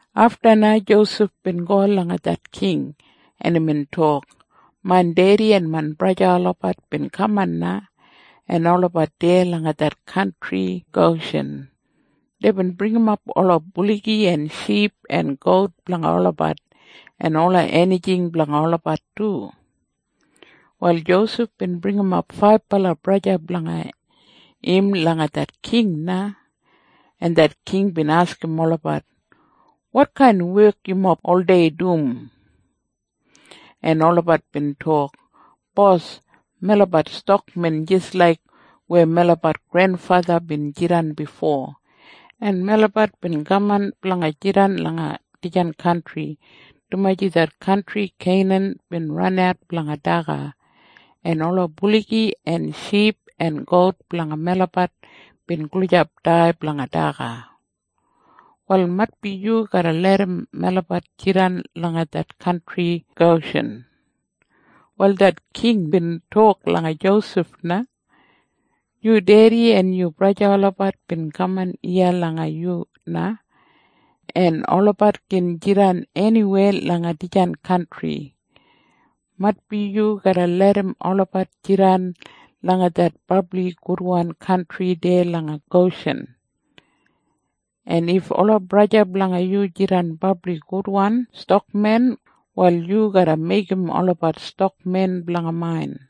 Afta na Josef bin go langa det king, en imbin tok, “Main dedi en main braja olabat bin kaman na, en olabat deya langa det kantri Goshin. Deibin bringimap ola buligi en ship en gout blanga olabat en ola enijing blanga olabat du.” Wal Josef bin bringimap faibala braja blanga im langa det king na, en det king bin askim olabat, “Wotkain wek yumob oldei dum?” En olabat bin tok, “Bos, melabat stakmen jis laik weya melabat grenfatha bin jidan bifo. En melabat bin kaman blanga jidan langa dijan kantri, dumaji det kantri Keinan bin ranat blanga daga, en ola buligi en ship en gout blanga melabat bin gulijap dai blanga daga. Wal maitbi yu garra larram melabat jidan langa det kantri Goshin?” Wal det king bin tok langa Josef na, “Yu dedi en yu braja olabat bin kaman iya langa yu na. En olabat gin jidan eniweya langa dijan kantri. Maitbi yu garra larram olabat jidan langa det brabli gudwan kantri deya langa Goshin. En if ola braja blanga yu jidan brabli gudwan stakmen, wal yu garra meigim olabat stakmen blanga main.”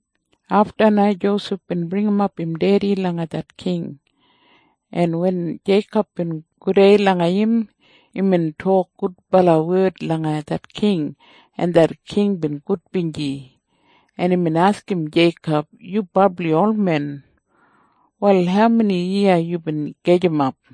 Afta na Josef bin bringimap im dedi langa det king, en wen Jeikob bin gudei langa im, imbin tok gudbala wed langa det king, en det king bin gudbinji, en imbin askim Jeikob, “Yu brabli olmen. Wal haumeni yiya yubin gajimap?”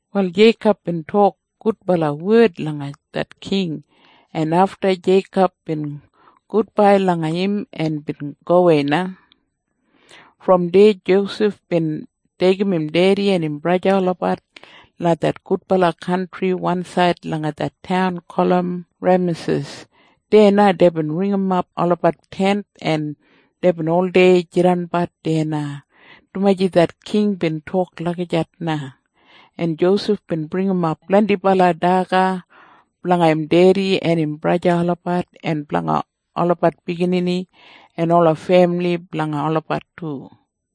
Wal Jeikob bin tok gudbala wed langa det king, en afta Jeikob bin gudbai langa im en bin gowei na. Brom deya Josef bin deigim im dedi en im braja olabat langa det gudbala kantri wansaid langa det taun gulum Remasis. Deya na deibin ringimap olabat tent, en deibin oldei jidanbat deya na, dumaji det king bin tok lagijat na. En Josef bin bringimap blendibala daga blanga im dedi en im braja olabat en blanga olabat biginini en ola femili blanga olabat du.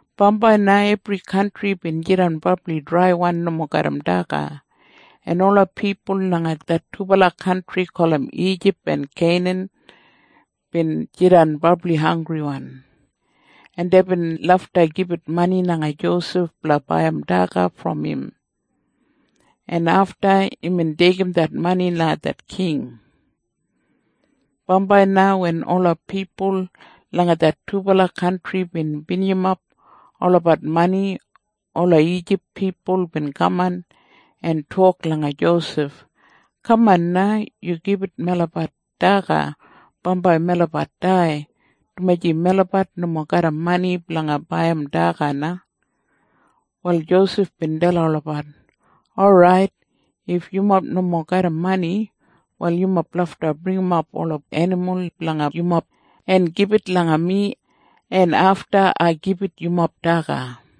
Bambai na ebri kantri bin jidan brabli draiwan nomo garram daga, en ola pipul langa det dubala kantri gulum Ijip en Keinan bin jidan brabli hanggriwan, en deibin lafta gibit mani langa Josef blanga baiyim daga brom im, en afta imbin deigim det mani langa det king. Bambai na wen ola pipul langa det dubala kantri bin binijimap olabat mani, ola Ijip pipul bin kaman en tok langa Josef, “Kaman na. Yu gibit melabat daga bambai melabat dai, dumaji melabat nomo garram mani blanga baiyim daga na.” Wal Josef bin dalim olabat, “Orait, if yumob nomo garram mani, wal yumob lafta bringimap ola enimul blanga yumob en gibit langa mi, en afta ai gibit yumob daga.”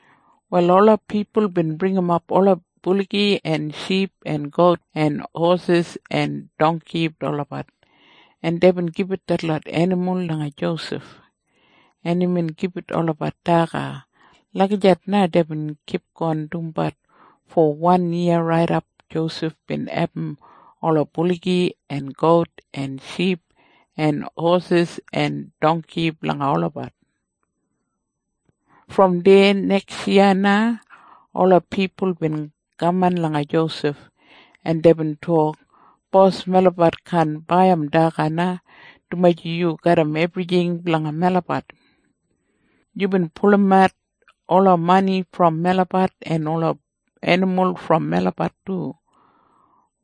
Wal ola pipul bin bringimap ola buligi en ship en gout en hosis en dongki olabat, en deibin gibit detlot enimul langa Josef, en imbin gibit olabat daga. Lagijat na deibin kipgon dumbat fo wan yiya raidap Josef bin abum ola buligi en gout en ship en hosis en dongki blanga olabat. Brom deya neksyiya na ola pipul bin kaman langa Josef, en deibin tok, “Bos melabat kaan baiyim daga na, dumaji yu garram ebrijing blanga melabat. Yubin pulumat ola mani brom melabat en ola enimul brom melabat du.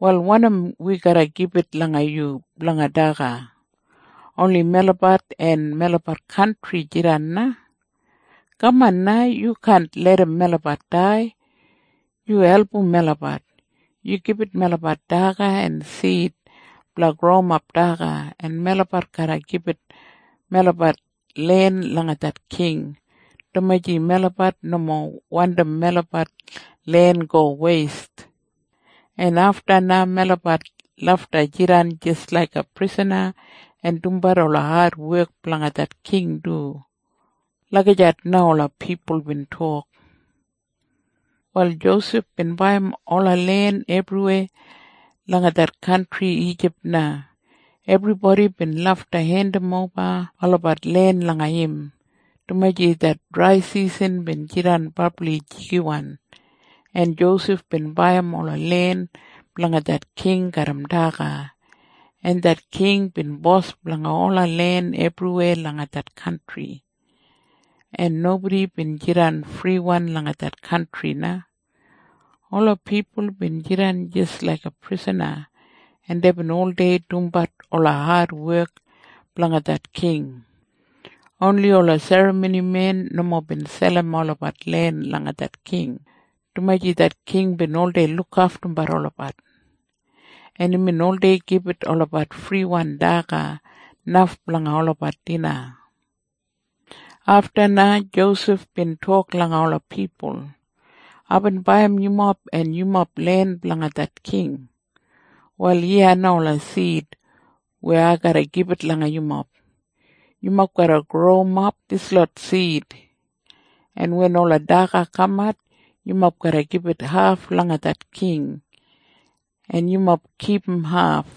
Wal wanim wi garra gibit langa yu blanga daga? Oni melabat en melabat kantri jidan na. Kaman na. Yu kaan larram melabat dai. Yu album melabat. Yu gibit melabat daga en sid blanga growimap daga, en melabat garra gibit melabat len langa det king, dumaji melabat nomo wandim melabat len go weist. En afta na melabat lafta jidan jis laiga prisana en dumbat ola adwek blanga det king du.” Lagijat na ola pipul bin tok. Wal Josef bin baiyim ola len ebriweya langa det kantri Ijip na. Ebribodi bin lafta hendimoba olabat len langa im, dumaji det draisisan bin jidan brabli jigiwan, en Josef bin baiyim ola len blanga det king garram daga, en det king bin bos blanga ola len ebriweya langa det kantri, en nobodi bin jidan friwan langa det kantri na. Ola pipul bin jidan jis laiga prisana, en deibin oldei dumbat ola adwek blanga det king. Oni ola serramonimen nomo bin selim olabat len langa det king, dumaji det king bin oldei lukaftumbat olabat, en imbin oldei gibit olabat friwan daga, naf blanga olabat dina. Afta na Josef bin tok langa ola pipul, “Aibin baiyim yumob en yumob len blanga det king. Wal iya na ola sid weya ai garra gibit langa yumob. Yumob garra growimap dislot sid, en wen ola daga kamat, yumob garra gibit haf langa det king, en yumob kipum haf.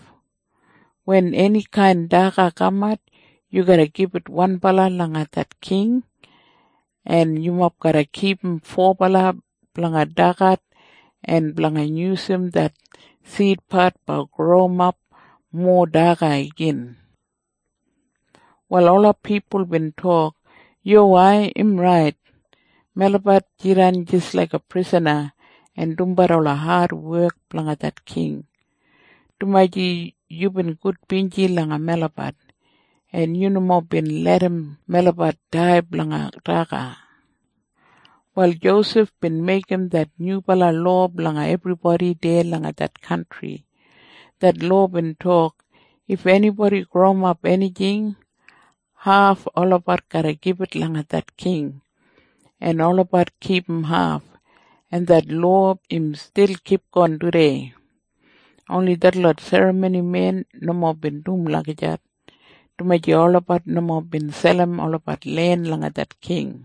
Wen enikain daga kamat, yu garra gibit wanbala langa det king en yumob garra kipum fobala blanga dagat en blanga yusum det sidpat blanga growimap mowa daga igin.” Wal ola pipul bin tok, “Yuwai. Im rait. Melabat jidan jis laiga prisana en dumbat ola adwek blanga det king, dumaji yubin gudbinji langa melabat, en yu nomo bin larram melabat dai blanga daga.” Wal Josef bin meigim det nyubala lowa blanga ebribodi deya langa det kantri. Det lowa bin tok, if enibodi growimap enijing, haf olabat garra gibit langa det king, en olabat kipum haf. En det lowa im stil kipgon tudei. Oni detlot serramonimen nomo dum lagijat, dumaji olabat nomo bin selim olabat len langa det king.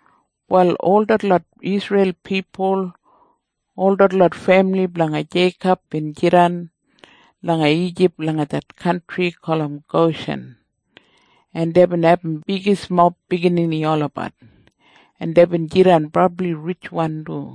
Wal ol detlot Isreil pipul, ol detlot femili blanga Jeikob bin jidan langa Ijip langa det kantri gulum Goshin, en deibin abum bigismob biginini olabat, en deibin jidan brabli ritjwan du.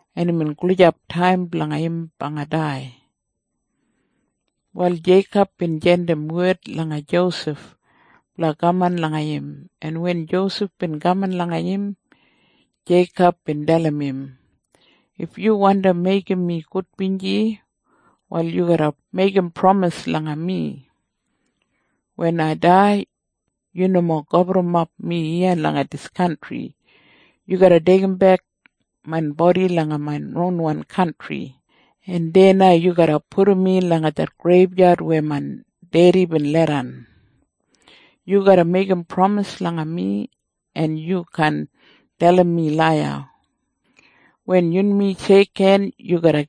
en imbin gulijap taim blanga im blanga dai. Wal Jeikob bin jandim wed langa Josef blanga kaman langa im, en wen Josef bin kaman langa im, Jeikob bin dalim im, “If yu wandi meigim mi gudbinji, wal yu garra meigim pramis langa mi. Wen ai dai, yu nomo gaburrumap mi iya langa dis kantri. Yu garra deigimbek main bodi langa main ronwan kantri, en deya na yu garra pudum mi langa det greibyad weya main dedi im leidan. Yu garra meigim pramis langa mi en yu kaan dalim mi laiya. Wen yunmi sheikhen yu garra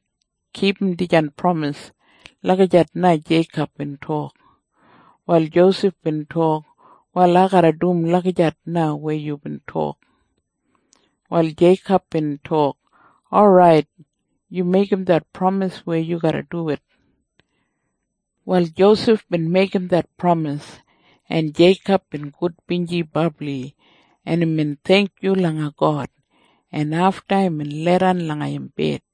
kipum dijan pramis.” Lagijat na Jeikob bin tok. Wal Josef bin tok, “Wal ai garra dum lagijat na weya yubin tok.” Wal Jeikob bin tok, “Orait, yu meigim det pramis weya yu garra duwit.” Wal Josef bin meigim det pramis, en Jeikob bin gudbinji brabli, en imbin theingkyu langa God, en afta imbin leidan langa im bed.